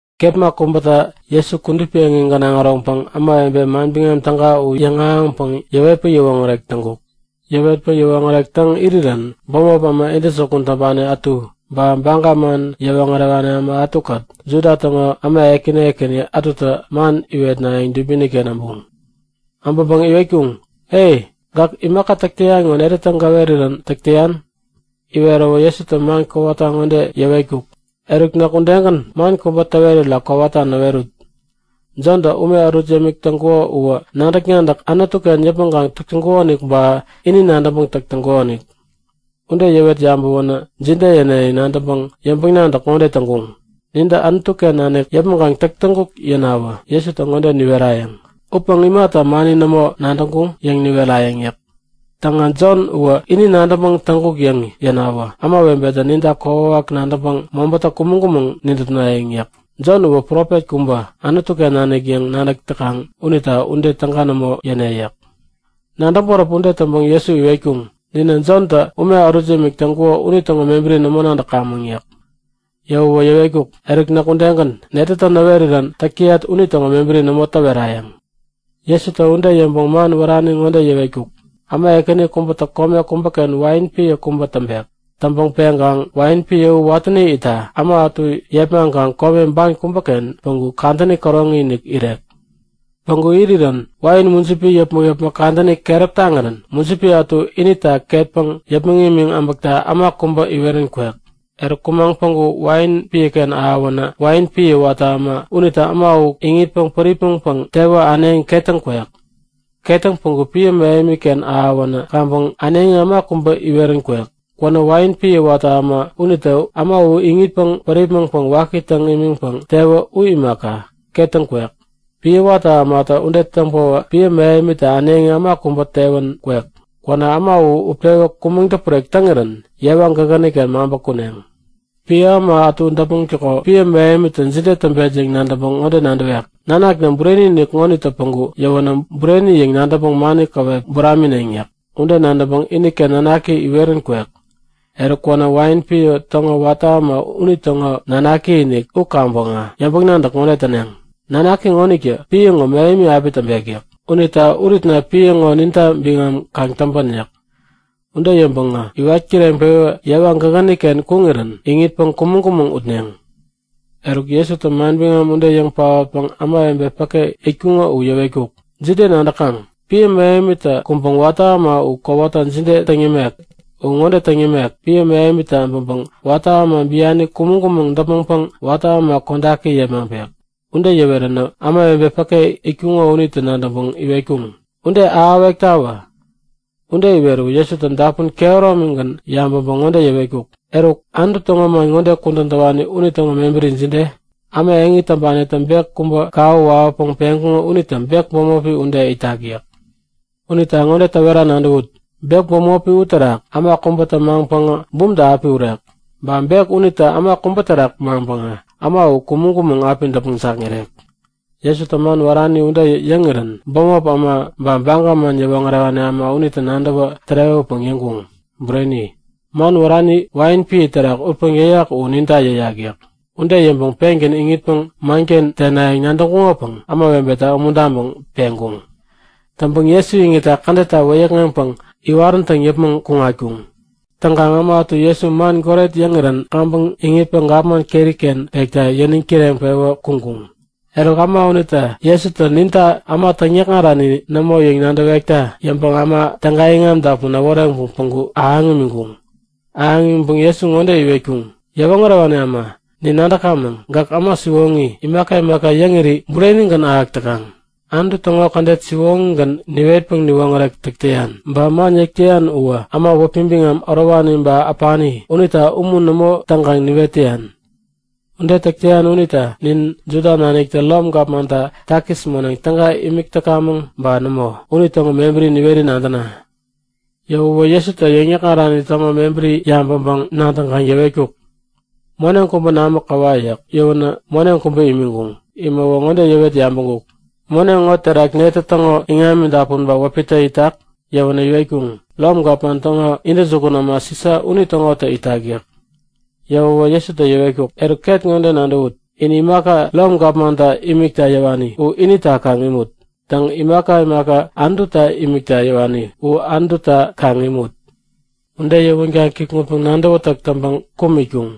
Kepma kubäta Jesu kudupi eŋi gänaŋ äroŋpäŋ ämawebe Manbiŋam Täga u yäŋahäŋpäŋ yäwetpäŋ yäwoŋärek täŋkuk. Yäwetpäŋ yäwoŋärek täŋ irirän bämop äma intäjukun täŋpani ätu, ba Baga man yäwoŋärewani äma ätukät Juda täŋo äma ekäni ekäni ätutä man iwetnayäŋ dubini-ken äbuŋ. Äbäŋpäŋ iwetkuŋ; E! Gäk imaka täk täyan ŋo netätä gäwerirän täk täyan? Iweräwä Jesutä man kowata ŋode yäwetkuk; Eruk näk udegän, man kubä täwerira kowata näwerut! Jontä ume ärut yämik täŋkuko uwä nadäk-nadäk Anutu-ken yäpmäŋkaŋ täk täŋkukonik ba ini nadäŋpäŋ täk täŋkukonik? Ude yäwet yabäwänä jide yäne yäŋ nadäŋpäŋ yäŋpäŋ-nadäk ŋode täŋkuŋ; Nintä Anutu-ken nanik yäpmäŋkaŋ täŋkuk yäŋ yänawä Jesutä ŋode niwerayäŋ; Upäŋ imata mani nämo nadäŋkuŋ? yäŋ niwerayäŋ yäk. Täŋä Jon uwä ini nadäŋpäŋ täŋkuk yäŋ yänawä ämawebetä ninta kokwawak nadäŋpäŋ mobätä kumäŋ-kumäŋ nidäpnayäŋ yäk. Jon uwä profet kubä, Anutu-ken nanik yäŋ nadäk täkaŋ unita ude täga nämo yäne yäk. Nadäŋ-bäräp ude täŋpäŋ Jesu iwetkuŋ; Ninä Jontä ume ärut yämik täŋkuko unitäŋo mebäri nämo nadäkamäŋ yäk. Yäwäwä yäwetkuk; Eruk, näk udegän netätä näwerirän täk täyat unitäŋo mebäri nämo täwerayäŋ. Jesutä ude yäŋpäŋ man wärani ŋode yäwetkuk; Äma ekäni kubätä kome kubäken wain piä kubä täŋpek. Täŋpäŋ peŋkaŋ wain piä u watäni itta äma ätu yepmaŋkaŋ kome ban kubäken päŋku kadäni käroŋi-inik irek. Päŋku irirän wain mujipi yäpmäk-yäpmäk kadäni keräp taŋirän mujipi ätu inita ketpäŋ yäpmäŋ imiŋ äbäkta äma kubä iwerän kwek. Eruk kumaŋ päŋku wain piäken ahäwänä wain piä watä äma unitä äma u iŋitpäŋ päripmäŋpäŋ tewä äneŋi ketäŋ kwek. Ketäŋ päŋku piä mähemi-ken ahäwänä kaŋpäŋ äneŋi äma kubä iwerän kwek. Kwänä wain piä watä äma unitä äma u iŋitpäŋ päripmäŋpäŋ waki täŋ imiŋpäŋ tewä u imaka, ketäŋ kwek. Piä watä ämatä ude täŋpäwä piä mähemitä äneŋi äma kubä iwerän kwek. Kwänä äma u utpewä kumäŋ-däpurek täŋirän yewa gägäni-ken maŋpä kuneŋ. Piä äma ätu däpmäŋtäko piä mähemitä jide täŋpet yäŋ nadäŋpäŋ ŋode nadäwek; Nanakna bureni-inik ŋonitä päŋku yäwänä bureni yäŋ nadäŋpäŋ mani käwep buramineŋ yäk. Ude nadäŋpäŋ iniken nanaki iwerän kwek. Eruk kwänä wain piä täŋo watä äma unitäŋo nanaki-inik u kaŋpäŋä yäŋpäŋ-nadäk ŋode täneŋ; Nanaki ŋonitä piä ŋo mähemi api täŋpek yäk. Unita uritna piä ŋo ninta biŋam kaŋ täŋpän yäk. Ude yäŋpäŋä iwat kireŋpewä yewa gägäni-ken kuŋirän iŋitpäŋ kumäŋ-kumäŋ utneŋ. Eruk Jesutä manbiŋam ude yäŋ paotpäŋ ämawebe päke itkuŋo u yäwetkuk; Jide nadäkaŋ? Piä mähemitä kuŋpäŋ watä äma u kowata jide täŋ yämek? U ŋode täŋ yämek; Piä mähemitä äbäŋpäŋ watä äma biani kumäŋ-kumäŋ däpmäŋpäŋ watä äma kodaki yepmaŋpek. Ude yäweränä ämawebe päke itkuŋo unitä nadäŋpäŋ iwetkuŋ; Ude ahäwektawä! Ude iweräwä Jesutä dapun kehäromigän yabäŋpäŋ ŋode yäwetkuk; Eruk, Anutu täŋo man ŋode kudän täwani unitäŋo mebäri jide? Äma eŋi täŋpanitä bek kubä kawä wawäpäŋ peŋkuŋo unitä bek bämopi ude itak yäk. Unita ŋode täwera nadäwut; Bek bämopi uterak äma kubätä maŋpäŋä bumta api urek. Ba bek unitä äma kubä terak maŋpäŋä äma u kumäŋ-kumäŋ api däpmäŋ jakŋirek. Jesutä man wärani ude yäŋirän bämop äma ba Baga man yäwoŋärewani äma unitä nadäwä tärewäpäŋ yäŋkuŋ; Bureni! Man wärani wain piä terak utpäŋ yäyak u ninta yäyak yäk. Ude yäŋpäŋ pengän iŋitpäŋ manken tenayäŋ nadäŋkuŋopäŋ ämawebeta umuntaŋpäŋ peŋkuŋ. Täŋpäŋ Jesu iŋitta kädetta wäyäkŋeŋpäŋ iwaräntäŋ yäpmäŋ kuŋatkuŋ. Täŋkaŋ äma ätu Jesu man goret yäŋirän kaŋpäŋ iŋitpäŋ gapman keri-ken pekta yäniŋ kireŋpewä kuŋkuŋ. Eruk äma unitä Jesutä ninta äma täŋyäkŋarani nämo yäŋ nadäwekta yäŋpäŋ äma täga iŋam dapun äworeŋpäŋ päŋku ahäŋ imiŋkuŋ. Ahäŋ imiŋpäŋ Jesu ŋode iwetkuŋ; Yäwoŋärewani äma! Nin nadäkamäŋ, gäk äma siwoŋi. Imaka imaka yäŋiri burenigän ahäk täkaŋ. Anutu täŋo kädet siwoŋigän niwetpäŋ näwoŋärek täk täyan. Ba man yäk täyan uwä äma wäpi biŋam ärowani ba äpani unita umun nämo täŋkaŋ niwet täyan. Ude täk täyan unita nin Juda naniktä Rom gapmanta takis moneŋ täga imik täkamäŋ ba nämo, unitäŋo mebäri niweri nadäna. Yäwäwä Jesutä yäŋ-yäkŋarani täŋo mebäri yabäŋpäŋ-nadäŋkaŋ yäwetkuk; Moneŋ kubä namä käwa yäk. Yäwänä moneŋ kubä imiŋkuŋ. Imäwä ŋode yäwet yabäŋkuk; Moneŋ ŋo terak netä täŋo iŋami dapun ba wäpitä itak? Yäwänä iwetkuŋ; Rom gapman täŋo intäjukun äma Sisa unitäŋotä itak yäk. Yäwäwä Jesutä yäwetkuk; Eruk ket ŋode nadäwut. In imaka imaka Rom gapmanta imikta yäwani u inita kaŋ imut. Täŋ, imaka imaka Anututa imikta yäwani u Anututa kaŋ imut. Ude yäwänkaŋ kikŋutpäŋ-nadäwätäk täŋpäŋ kum itkuŋ.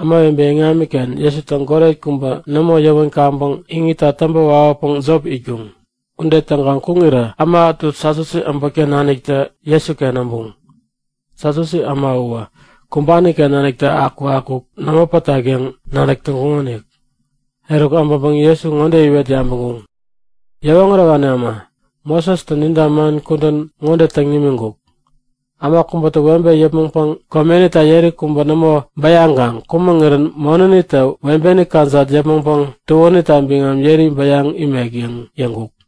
Ämawebe iŋamiken Jesutä goret kubä nämo yäwän kaŋpäŋ iŋitta täŋpä wawäpäŋ jop itkuŋ. Ude täŋkaŋ kuŋirä äma ätu Satyusi äbotken naniktä Jesuken äbuŋ. (Satyusi äma uwä kumbani-ken nanik akukakuk nämo pätak yäŋ nadäk täŋkuŋonik.) Eruk abäŋpäŋ Jesu ŋode iwet yabäŋkuŋ; Yäwoŋärewani äma, Mosestä ninta man kudän ŋode täŋ nimiŋkuk; Äma kubätä webe yäpmäŋpäŋ komenita yeri kubä nämo bäyaŋkaŋ kumäŋirän monänitä webeni kajat yäpmäŋpäŋ tuänita biŋam yeri bäyaŋ imek yäŋ yäŋkuk.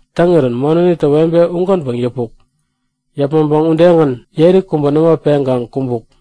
Täŋirän monänitä webe ugänpäŋ yäpuk. Yäpmäŋpäŋ udegän yeri kubä nämo peŋkaŋ kumbuk.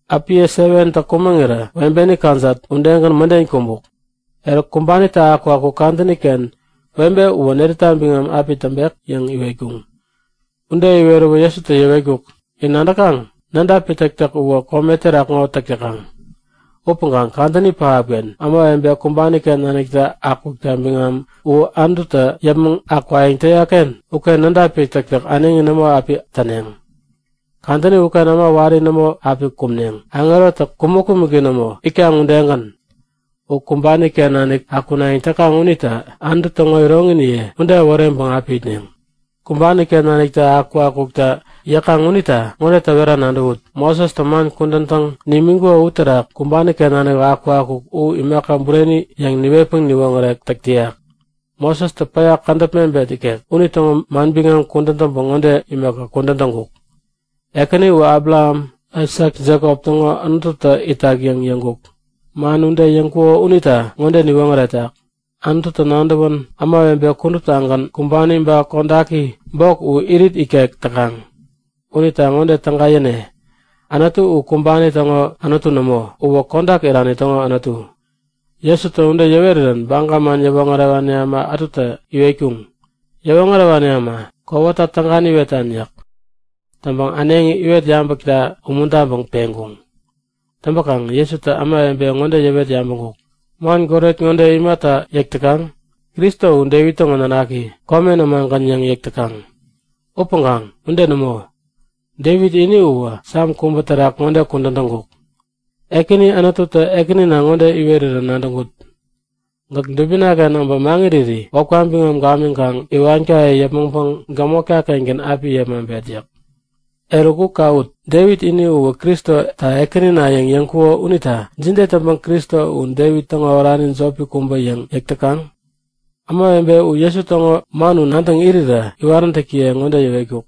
Äpiye 7tä kumäŋirä webeni kajat udegän mäden kumbuk. Eruk, kumbanitä akukakuk kadäni-ken webe uwä netäta biŋam api täŋpek? yäŋ iwetkuŋ. Ude iweräwä Jesutä yäwetkuk; In nadäkaŋ? Ämawebe Nädapi täktäk uwä kome terak ŋo täk täkaŋ. Upäŋkaŋ kadäni pähapken ämawebe kumbani-ken naniktä akukta biŋam u Anututä yäpmäŋ akwayäŋ täyak-ken uken nädapi täktäk äneŋi nämo api täneŋ. Kadäni uken äma wari nämo api kumneŋ, aŋerotä kumäk-kumäki nämo itkaŋ udegän. U kumbani-ken nanik akunayäŋ täkaŋ unitä Anutu täŋo iroŋiniye ude äworeŋpäŋ api itneŋ. Kumbani-ken naniktä akukakukta yäkaŋ unita ŋode täwera nadäwut; Mosestä man kudän täŋ nimiŋkuko uterak kumbani-ken nanik akukakuk u imaka bureni yäŋ niwetpäŋ niwoŋärek täk täyak. Mosestä päya kädäp mebet ikek unitäŋo manbiŋam kudän täŋpäŋ ŋode imaka kudän täŋkuk; Ekäni u Abraham, Aisak, Jekop täŋo Anututä itak yäŋ yäŋkuk. Man ude yäŋkuko unitä ŋode niwoŋäretak; Anututä nadäwän ämawebe kuduptagän, kumbani ba kodaki bok u irit ikek täkaŋ. Unita ŋode täga yäne; Anutu u kumbani täŋo Anutu nämo. Uwä kodak irani täŋo Anutu. Jesutä ude yäwerirän Baga man yäwoŋärewani äma ätutä iwetkuŋ; Yäwoŋärewani äma, kowata täga niwetan yäk. Täŋpäŋ äneŋi iwet yabäkta umuntaŋpäŋ peŋkuŋ. Täŋpäkaŋ Jesutä ämawebe ŋode yäwet yabäŋkuk; Man goret ŋode imata yäk täkaŋ? Kristo u Devit täŋo nanaki, komen ämagän yäŋ yäk täkaŋ. Upäŋkaŋ ude nämo! Devit ini uwä Sam kubä terak ŋode kudän täŋkuk; Ekäni Anututä Ekänina ŋode iwerirän nadäŋkut; Gäk dubina-ken äbä maŋiriri wäpka biŋam gamiŋkaŋ iwankaye yäpmäŋpäŋ gämotka-kengän api yepmaŋpet yäk. Eruk, u kawut! Devit ini uwä Kristota Ekänina yäŋ yäŋkuko unita jide täŋpäŋ Kristo u Devit täŋo orani jopi kubä yäŋ yäk täkaŋ? Ämawebe u Jesu täŋo man u nadäŋ irirä iwaräntäkiye ŋode yäwetkuk;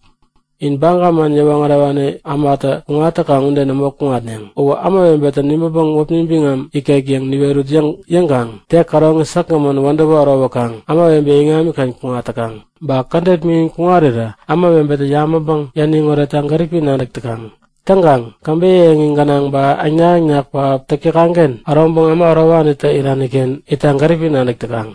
In Baga man yäwoŋärewani ämatä kuŋat täkaŋ ude nämo kuŋatneŋ. Uwä ämawebetä nibäŋpäŋ wäpi biŋam ikek yäŋ niwerut yäŋkaŋ tek käroŋi säkgämän wädäwä ärowäkaŋ ämawebe iŋamiken kuŋat täkaŋ. Ba kädet miŋin kuŋarirä ämawebetä yabäŋpäŋ yäniŋ oretta gäripi nadäk täkaŋ. Täŋkaŋ käbeyä eŋi gänaŋ ba äŋnak-äŋnak pähap täk täkaŋ-ken äroŋpäŋ äma ärowanitä irani-ken itta gäripi nadäk täkaŋ.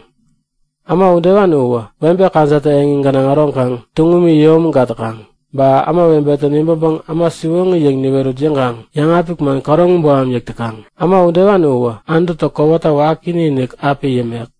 Äma udewani uwä webe kajattä eŋi gänaŋ äroŋkaŋ tuŋumi yäyomägat täkaŋ. Ba ämawebetä nibäŋpäŋ äma siwoŋi yäŋ niwerut yäŋkaŋ yäŋapik man käroŋi boham yäk täkaŋ. Äma udewani uwä Anututä kowata waki taŋi-inik api yämek.